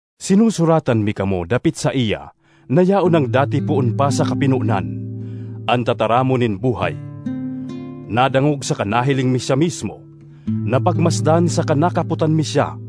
Sinusuratan mi kamo dapit saiya na yaon nang dati poon pa sa kapinonan—an tataramon nin buhay. Nadangog saka nahiling mi siya mismo; napagmasdan saka nakapotan mi siya.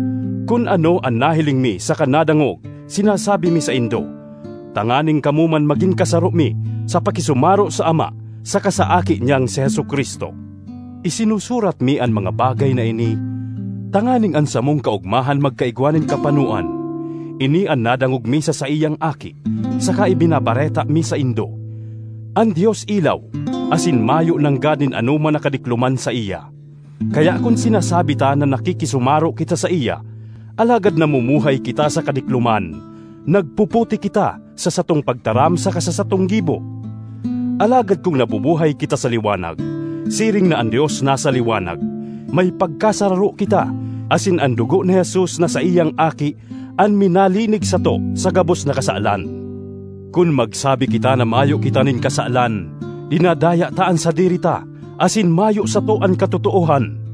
Kun ano an nahiling mi saka nadangog sinasabi mi saindo, tanganing kamo man magin kasaro mi sa pakisumaro sa Ama saka sa Aki niyang si Jesu-Cristo. Isinusurat mi an mga bagay na ini tanganing an samong kaogmahan magkaigwa nin kapanoan. Ini an nadangog mi sa saiyang Aki saka ibinabareta mi saindo: an Dios ilaw, asin mayo nanggad nin anoman na kadikloman saiya. Kaya kun sinasabi ta na nakikisumaro kita saiya, alagad namumuhay kita sa kadikloman, nagpuputik kita sa satong pagtaram saka sa satong gibo. Alagad kun nabubuhay kita sa liwanag—siring na an Dios nasa liwanag—may pagkasararo kita, asin an dugo ni Jesus na saiyang Aki an minalinig sato sa gabos na kasalan. Kun magsabi kita na mayo kita nin kasalan, dinadaya ta an sadiri ta, asin mayo sato an katotoohan.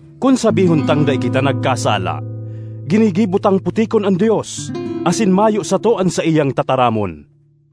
Kun sabihon tang dai kita nagkasala, ginigibo tang putikon an Dios, asin mayo sato an saiyang tataramon.